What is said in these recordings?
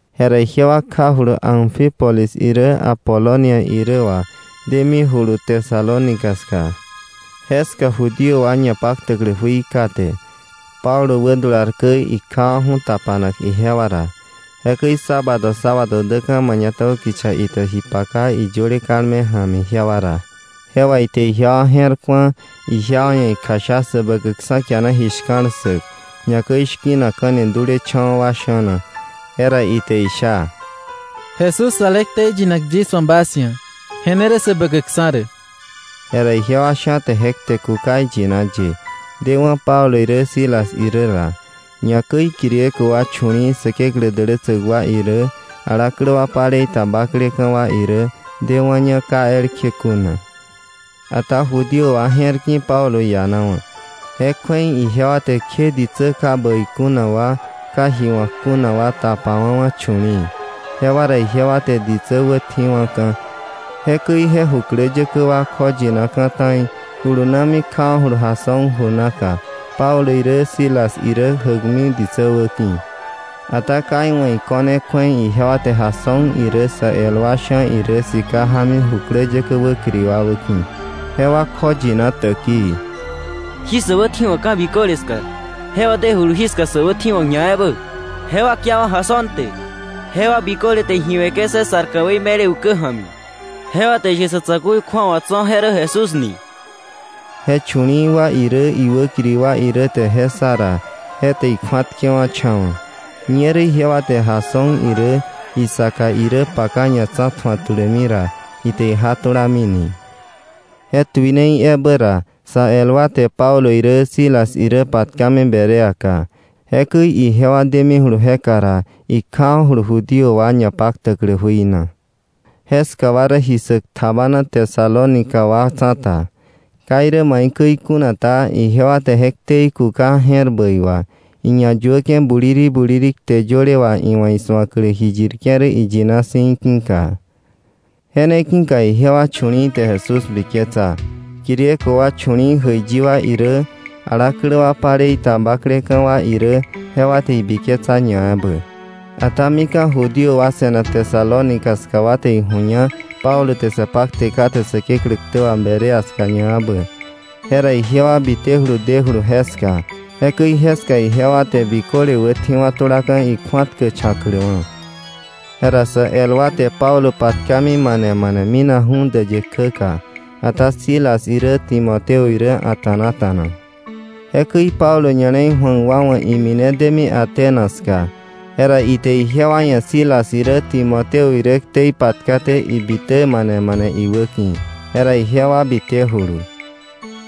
Jera ijewa kjajulu Anfípolis irä Apolonia irä wà demi julu Tesalónica ska. Jeska Judío wa ñapaktäklä jui kate. Pablo wädular käi, ikjawa̱ju̱ tapanak ijewa ra. Jekäi sábado sábado däka̱ mañatäbä kicha ite ji paka iyöle kalme ja̱mi ijewa ra. Je wà ite ijewa je̱r ku̱a, ijewa ia̱ ikjasha Säbäkäkksa̱ kiana ji shka̱l ssäk, ñakäi shki̱nakka̱ni dulecha̱wa̱ wa sha̱na. Jera ite isha: —Jesús ale ktei yinak yis wa̱ bas ia̱, je ne rä Säbäkäkksa̱ rä. Jera ijewa sha̱ te je kte kuka iyina ye, dewa̱ Pablo irä Silas irä ra. Ñakäi Griego wa chu̱li̱i̱ Säkeklä dälätsäk wa irä, alaklä wa palei ta bakleka̱ wa irä, dewa̱ña ka elkje kuna. Ata Judío wa je̱r ki̱ Pablo ianawa̱. Je kju̱ei ijewa te kje ditsä ka bäi kuna wa, ka ji wa̱k kuna wa tapawa̱wa̱ chu̱li̱i̱. Jewa ra ijewa te ditsä wätji̱wa̱ka̱, jekäi je jukläyäkä wa kjoyinaka̱ ta̱i, julunami kjawa̱julu Jasón ju naka, Pablo irä Silas irä jäkmi ditsä wäki̱. Ata ka iwa̱ iko̱ne kju̱ei ijewa te Jasón irä sä el wa sha̱ irä sika jámi jukläyäkä wäkiri wa wäki̱. Jewa kjoyina täkii: —Jí sä wätji̱wa̱k ka̱ biköle ska, jewa dejulu jíka sä wätji̱wa̱k ñaebä. Jewa kiawa̱ Jasón te. Jewa biköle te ji we̱ke̱ César ka̱wei me̱le ukä ja̱mi. Jewa te ishe sa̱ tsa̱ku̱i kju̱awa tso̱, je rä Jesús ni. Je chu̱li̱i̱ wa irä, iwäkiri wa irä te je ssa ra, je te ikju̱atkewa̱cha̱wa̱. Ñerä ijewa te Jasón irä, isaka irä paka ñatsa̱tju̱ak tulämi ra, ite ija tulamini. Je tuinei ebä ra, sa el wa te Pablo irä Silas irä patkami Bereaka. Jekäi ijewa demijulu jeka ra, ikjawa̱julu Judío wa ñapaktäklä jui na. Jeska wa rä ji ssäk tjabana Tesalónica wa tsa̱ta. Ka irä maikäi kuna ta, ijewa te je ktei kuka je̱r bäi wà, iñayuäke̱ buliri buliri kte yöle wà iwa̱ isu̱aklä ji yirke̱ rä iyina si̱ í̱ ki̱ka. Je ne ki̱ka ijewa chu̱li̱i̱ te Jesús biketsa. Griego wa chu̱li̱i̱ jäiyi wa irä, alaklä wa palei ta bakleka̱ wa irä jewa te ibiketsa ñaebä. Ata mika̱ Judío wa se̱nak Tesalónica ska wa te iju̱ña Pablo te sa pakte kate Säkeklä ktä wà Berea ska ñaebä, jera ijewa bitejulu dejulu jeska. Jekäi jeska ijewa te biköle wätji̱wa̱ tulaka̱ ikju̱atkächa̱kläwa̱. Jera sa el wa te Pablo patkami mane mane minakju̱ däyë kjäka. Ata Silas irä Timoteo irä a̱ta̱nata̱na. Jekäi Pablo ña̱le̱i ju̱ak wa wa̱ imine demi Atenas ska. Jera ite ijewa ia̱ Silas irä Timoteo irä ktei patkaté ibitä mane mane iwäki̱. Jera jewa bitejulu.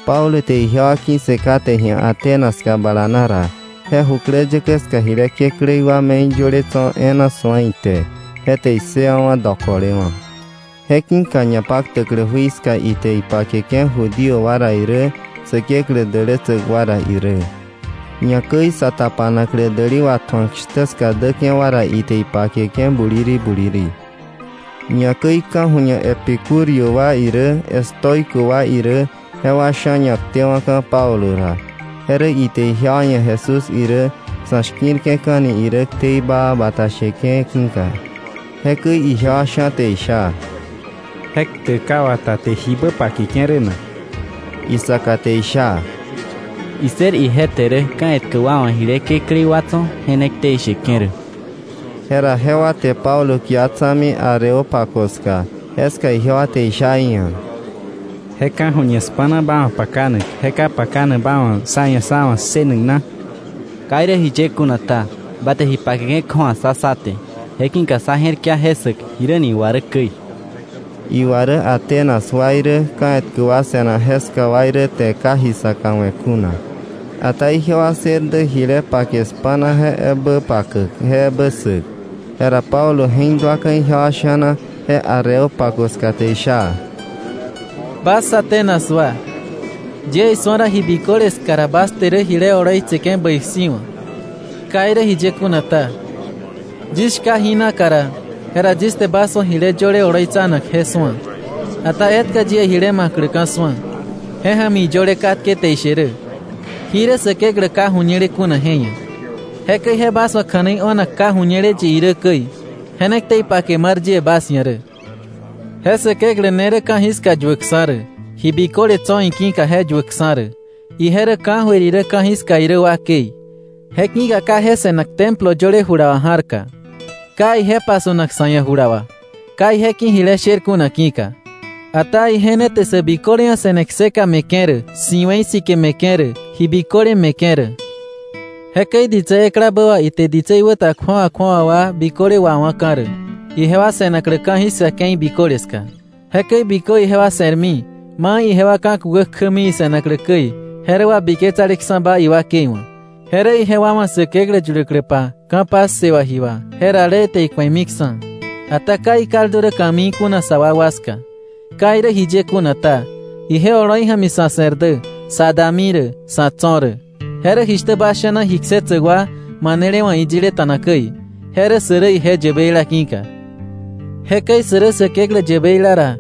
Pablo te ijewa ki̱ssë katke ji̱a Atenas ska bala na ra, je jukläyäkä ska jile kekläí wa me̱i yöle tso̱ e̱e̱na su̱a ite. Je te issëwa̱ dokolewa̱. Je ki̱ka ñapaktäklä jui ska ite ipakeke̱ Judío wa ra irä, Säkeklä dälätsäk wa ra irä. Ñakäi sa tapanaklä däli watju̱ak shtä ska däke̱ wa ra ite ipakeke̱ buliri buliri. Ñakäi ka̱ju̱ñe epicúreo wa irä, estoico wa irä, jewa sha̱ ñaktewa̱ka̱ Pablo ra. Je rä ite ijewa ia̱ Jesús irä sa̱ shki̱rke̱ka̱ni irä ktei baa bata sheke̱ ki̱ka. Jekäi ijewa sha̱ te isha: —¿Je ktäk ka wata te jibä pakeke̱ rä na? Isaka te isha: —Issër ije te rä ka̱ etkä wa wa̱ jile kekläí wa tso̱ je ne ktei sheke̱ rä. Jera jewa te Pablo kia tsa̱mi Areópago ska. Jeska ijewa te isha iia̱: —¿Je ka̱ju̱ñe spa̱na ba wa̱ pakanak je ka pakanak ba wa̱ sá ia̱ sá wa̱ ssënak na? Ka irä jiye kuna ta, ba te ji pakeke̱ kju̱awa ssá sá te, je ki̱ka sá je̱rkia je ssäk jiräni iwa rä käi. Iwa rä Atenas wa irä ka̱ etkä wa se̱nak jeska wa irä te ka ji saka we̱ kuna. Ata ijewa ssër dä jile pake spa̱na je ebä pakäk, je ebä ssäk. Jera Pablo je̱k duaka̱ ijewa sha̱na je Areópago ska te isha: —Bas Atenas wa, yie isu̱a ra ji biköle ska ra bas te rä jile oloitseke̱ bäi si̱wa̱. Ka irä jiye kuna ta, yis shka jí naka ra, jera yis te bas wa̱ jile yöle oloitsanak je su̱a. Ata etka yie jile ma̱kläka̱ su̱a, je ja̱mi iyöle katke te ishe rä: ‘Jí rä Säkeklä Ka Ju̱ñele Kuna je ia̱.’ Jekäi je bas wa̱ kja̱nei o̱nak ka ju̱ñele yi irä käi, je ne ktei pake mar yie bas ia̱ rä. “Je Säkeklä ne rä ka̱jiska yuäkksa̱ rä, ji biköle tso̱ iki̱ka je yuäkksa̱ rä, ije rä ka̱jöir irä ka̱jiska irä wakei. Je ki̱ka ka je se̱nak templo yöle jula wà ja̱rka. Ka ije pasu̱nak sa̱ ia̱ jula wà, ka je ki̱ jile sher kuna ki̱ka. Ata ije ne te sä biköle ia̱ se̱ne kseka me̱ke̱ rä, si̱we̱i sike me̱ke̱ rä, ji biköle me̱ke̱ rä. “Jekäi ditsä eklabä wà ite ditsei wä ta kju̱awa kju̱awa wa biköle wawa̱ka̱ rä, ijewa se̱naklä ka̱jiska ke̱i biköle ska. Jekäi bikö ijewa se̱rmi, mai ijewa ka̱ kukä kjämi ise̱naklä käi, je rä wabiketsaleksa̱ba iwakei wa̱. Je rä ijewa wa̱ Säkeklä yuläkläpa ka̱ passe wà ji wà, je rale ite iku̱emiksa̱. Ata ka ikaldu rä ka̱mii kuna sa wakwa ska. Ka irä jiye kuna ta, ije oloi ja̱mi sa̱ se̱r dä, sa̱ dami rä, sa̱ tso̱ rä. Je rä jishtä bas sha̱na ji ksetsäk wa manele wa̱ iyileta̱na käi: ‘Je rä sä rä ije yäbeila ki̱ka.’ “Jekäi sä rä Säkeklä yäbeila ra,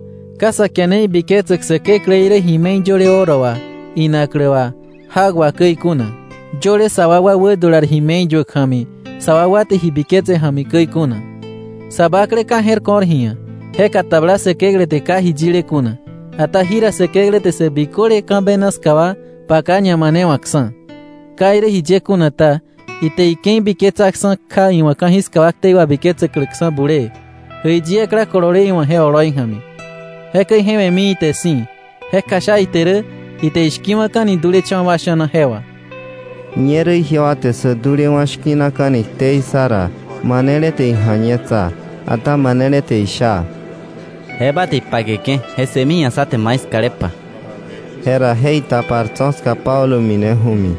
ka sa kiane ibiketsäk sä Kekläí rä ji me̱i yöle oro wà, inaklä wà, jak wà käi kuna, yöle sa wakwa wädular ji me̱i yuäk ja̱mi, sa wakwa te ji biketse ja̱mi käi kuna. Sa bakle ka je̱r ko̱r ji ia̱, je katabla Säkeklä te ka ji yile kuna, ata jira Säkeklä te sä biköle ka̱ bena ska wa paka ñamanewa̱ksa̱. Ka irä jiye kuna ta, ite ike̱i biketsaksa̱ kja iwa̱ ka̱jiska wa ktei wabiketsäkläksa̱ bulee, jäiyi ekla kolole iwa̱ je oloi ja̱mi. Jekäi je we̱mi ite si̱, je kjasha ite rä ite ishki̱wa̱ka̱ni dulecha̱wa̱ wa sha̱na je wà.” Ñerä ijewa te sä dulewa̱ shki̱naka̱ni ktei ssa ra, manele te ija̱ñetsa. Ata manele te isha: —Je ba te ipakeke̱ je ssëmi ji̱a sá te mai skalepa. Jera je itapar tso̱ ska Pablo mineju̱mi.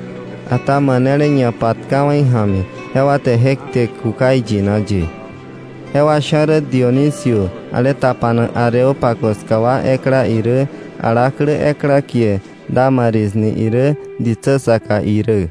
Ata manele ñapatkawa̱ ija̱mi, jewa te je kte kuka iyina ye. Jewa sha̱ rä Dionisio, ale tapanak Areópago ska wa ekla irä, alaklä ekla kie Dámaris ni irä, ditsä saka irä.